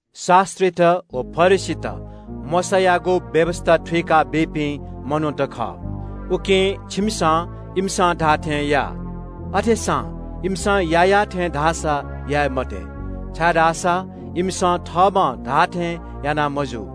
“शास्‍त्रीत व फरिसीत मोशायागु व्‍यवस्‍था थुइका बीपिं मनूत खः। उकिं छिमिसं इमिसं धाःथें या। अथेसां इमिसं याःयाः थें धाःसा याये मते, छाय्‌धाःसा इमिसं थःम्‍हं धाःथें याना मजू।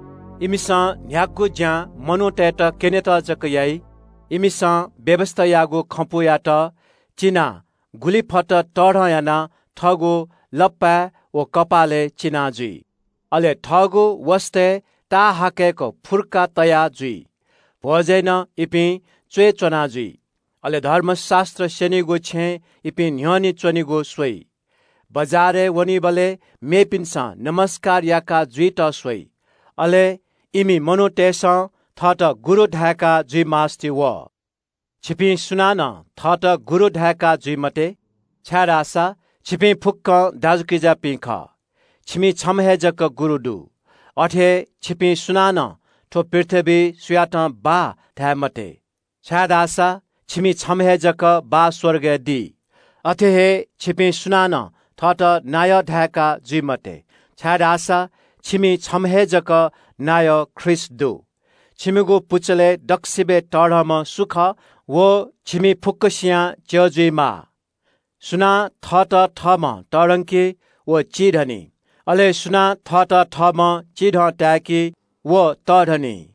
“इमिसं न्‍ह्यागु ज्‍यां मनूतय्‌त क्‍यनेत जक याइ। इमिसं व्‍यवस्‍थायागु खँपुयात चिनाः गुलि फत तःधं यानाः थःगु लप्‍पाय् व कपालय् चिना जुइ। अले थःगु वसतय् ताःहाकय्‌क फुर्का तया जुइ। भ्‍वजय् नं इपिं च्‍वय् च्‍वना जुइ। अले धर्मशास्‍त्र स्‍यनीगु छेँय् इपिं न्‍ह्यःने च्‍वनेगु स्‍वइ। बजारय् वनीबलय् मेपिन्‍सं ज्‍वजलपा याका जुइत स्‍वइ, अले इमि मनूतय्‌सं थःत ‘गुरु’ धाय्‌का जुइ मास्‍ति वः। “छिपिं धाःसा थःत ‘गुरु’ धाय्‌का जुइ मते, छाय्‌धाःसा छिपिं फुक्‍कं दाजुकिजापिं खः, छिमि छम्‍ह हे जक गुरु दु। अथे हे छिपिं सुनानं थ्‍व पृथ्‍वीइ सुयातं ‘बाः’ धाये मते, छाय्‌धाःसा छिमि छम्‍ह हे जक बाः स्‍वर्गय् दी। अथे हे छिपिं सुनानं थःत नायः धायेका जुइ मते, छाय्‌धाःसा छिमि छम्‍ह हे जक नायः ख्रीष्‍ट दु। छिमिगु पुचलय् दक्‍वसिबय् तःधंम्‍ह सु खः, व छिमि फुक्‍कसियां च्‍यः जुइमाः। सुनां थःत थःम्‍हं तःधंकी व चिधंनी। अले सुनां थःत थःम्‍हं चिधं ताय्‌की व तःधंनी।”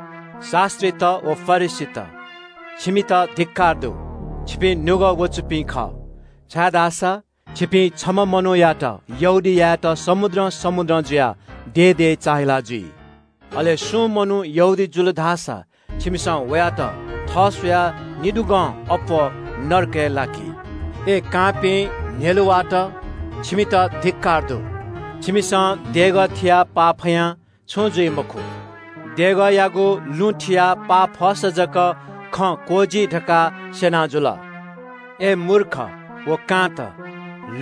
“शास्‍त्रीत व फरिसीत, छिमित धिक्‍कार दु। छिपिं निपाः ख्‍वाःपाः दुपिं खः, छाय्‌धाःसा छिपिं छम्‍ह मनूयात यहूदी यायेत समुद्रं समुद्रं जुयाः दे दे चाःहिला जुइ। अले सुं मनू यहूदी जुल धाःसा छिमिसं वयात थः स्‍वयाः निदुगं अप्‍वः नरकय् लाकी। “अय् कांपिं न्‍ह्यलुवाःत, छिमित धिक्‍कार दु। छिमिसं देगः थियाः पाफयां छुं जुइ मखु, देगःयागु लुँ थियाः पाफसा जक खँ क्‍वःजी धकाः स्‍यना जुल। अय् मूर्ख व कांत,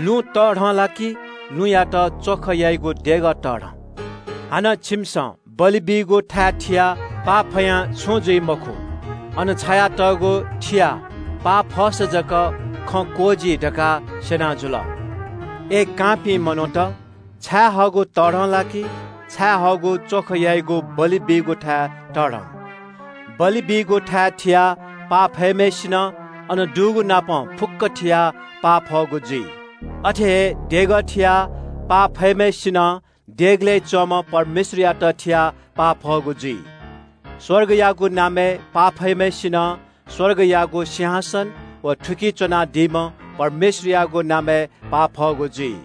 लुँ तःधं ला कि लुँयात च्‍वख याइगु देगः तःधं? हानं छिमिसं बलि बीगु थाय् थियाः पाफयां छुं जुइ मखु, अन छायातःगु थियाः पाफसा जक खँ क्‍वःजी धकाः स्‍यना जुल। अय् कांपिं मनूत, छायेहःगु तःधं ला कि छायेहःगु च्‍वख याइगु बलि बीगु थाय् तःधं? बलि बीगु थाय् थियाः पाफम्‍हय्‌सिनं अन दुगुनापं फुक्‍क थियाः पाफःगु जुइ। अथे हे देगः थियाः पाफम्‍हय्‌सिनं देगलय् च्‍वंम्‍ह परमेश्‍वरयात थियाः पाफःगु जुइ। स्‍वर्गयागु नामय् पाफम्‍हय्‌सिनं स्‍वर्गयागु सिंहासन व थुकी च्‍वनादीम्‍ह परमेश्‍वरयागु नामय् पाफःगु जुइ।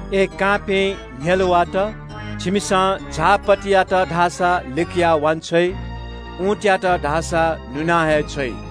अय् कांपिं न्‍ह्यलुवाःत, छिमिसं झाःपत्तियात लिकयाः वांछ्वइ। उँटयात धाःसा नुना हे छ्वइ।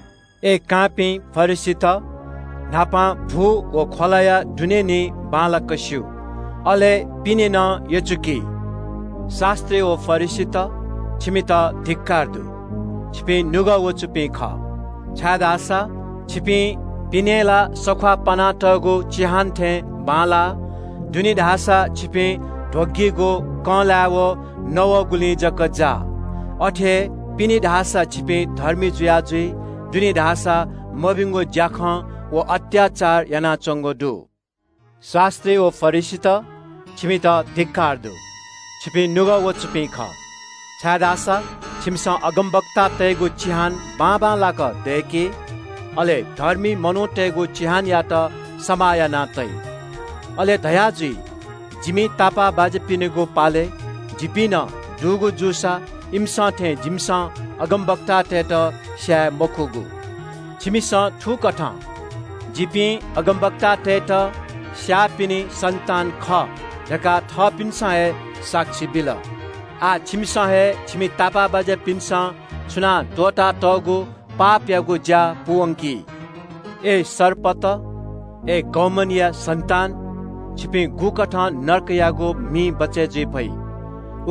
अय् कांपिं फरिसीत, न्‍हापां भु व ख्‍वलाया दुने निं बांलाक स्‍यू। अले तिनि पिने नं यचुकी। “शास्‍त्री व फरिसीत, छिमित धिक्‍कार दु। छिपिं निपाः ख्‍वाःपाः दुपिं खः, छाय्‌धाःसा छिपिं पिने ला सख्‍वाः पानातःगु चिहान थें बांलाः। दुने धाःसा छिपिं ध्‍वगीगु कँलाय् व नवःगुलिं जक जाः। अथे हे पिने छिपिं धर्मी जुया जुइ, दुने धाःसा छिमिसं मभिंगु ज्‍याखँ व अत्‍याचार यानाच्‍वंगु दु।” “शास्‍त्री व फरिसीत, छिमित धिक्‍कार दु। छिपिं निपाः ख्‍वाःपाः दुपिं खः, छाय्‌धाःसा छिमिसं अगमवक्तातय्‌गु चिहान बाबांलाक दय्‌की। अले धर्मी मनूतय्‌गु चिहानयात समाः याना तइ। अले धयाजुइ – ‘जिमि तापाःबाज्‍यापिनिगु पालय् जिपिं दुगु जूसा इमिसं थें जिमिसं अगमवक्तातय्‌त स्‍याये मखुगु।’ “छिमिसं थुकथं ‘जिपिं अगमवक्तातय्‌त स्‍याःपिनि सन्‍तान खः’ धकाः थःपिन्‍सं हे साक्षी बिल। आः छिमिसं हे छिमि तापाःबाज्‍यापिन्‍सं छुनाः त्‍वःतातःगु पापयागु ज्‍या पूवंकि। अय् सर्पत, अय् बिख दुम्‍ह सर्पया सन्‍तान, छिपिं गुकथं नरकयागु मिं बचय् जुइ फइ?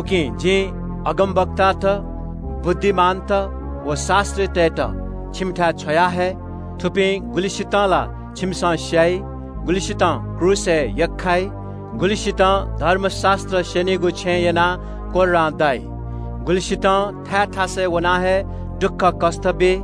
“उकिं जिं अगमवक्तात, बुद्धिमानत व शास्‍त्रीतय्‌त छिमिथाय् छ्वयाहये। थुपिं गुलिसितं ला छिमिसं स्‍याइ, गुलिसितं क्रूसय् यख्‍खाइ, गुलिसितं धर्मशास्‍त्र स्‍यनीगु छेँय् यनाः कोर्रां दाइ, गुलिसितं थाय् थासय् वनाः हे दुःखकष्‍ट बी।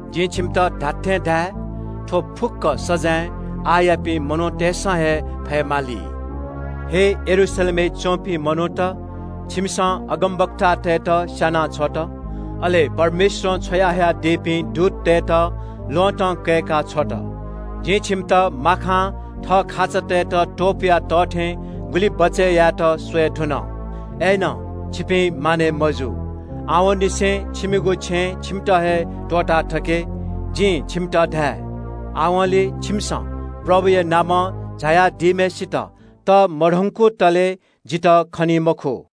जिं छिमित खःगु खँ धाये – थ्‍व फुक्‍क सजाँय आःयापिं मनूतय्‌सं हे फयेमाली।” “हे यरूशलेमय् च्‍वंपिं मनूत, छिमिसं अगमवक्तातय्‌त स्‍याना छ्वल, अले परमेश्‍वरं छ्वयाहयादीपिं दूततय्‌त ल्‍वहँतं कय्‌का छ्वल। जिं छिमित माखां थः खाचातय्‌त त्‍वपुया तः थें गुलि बचय् यायेत स्‍वये धुन। अय्‌नं छिपिं मानय् मजू। आवंनिसें छिमिगु छेँ छिमित हे त्‍वःताथके। जिं छिमित धाये – आवंलि छिमिसं प्रभुया नामं झाःम्‍हय्‌सित तःमधंकुतले जितः खनी मखु।”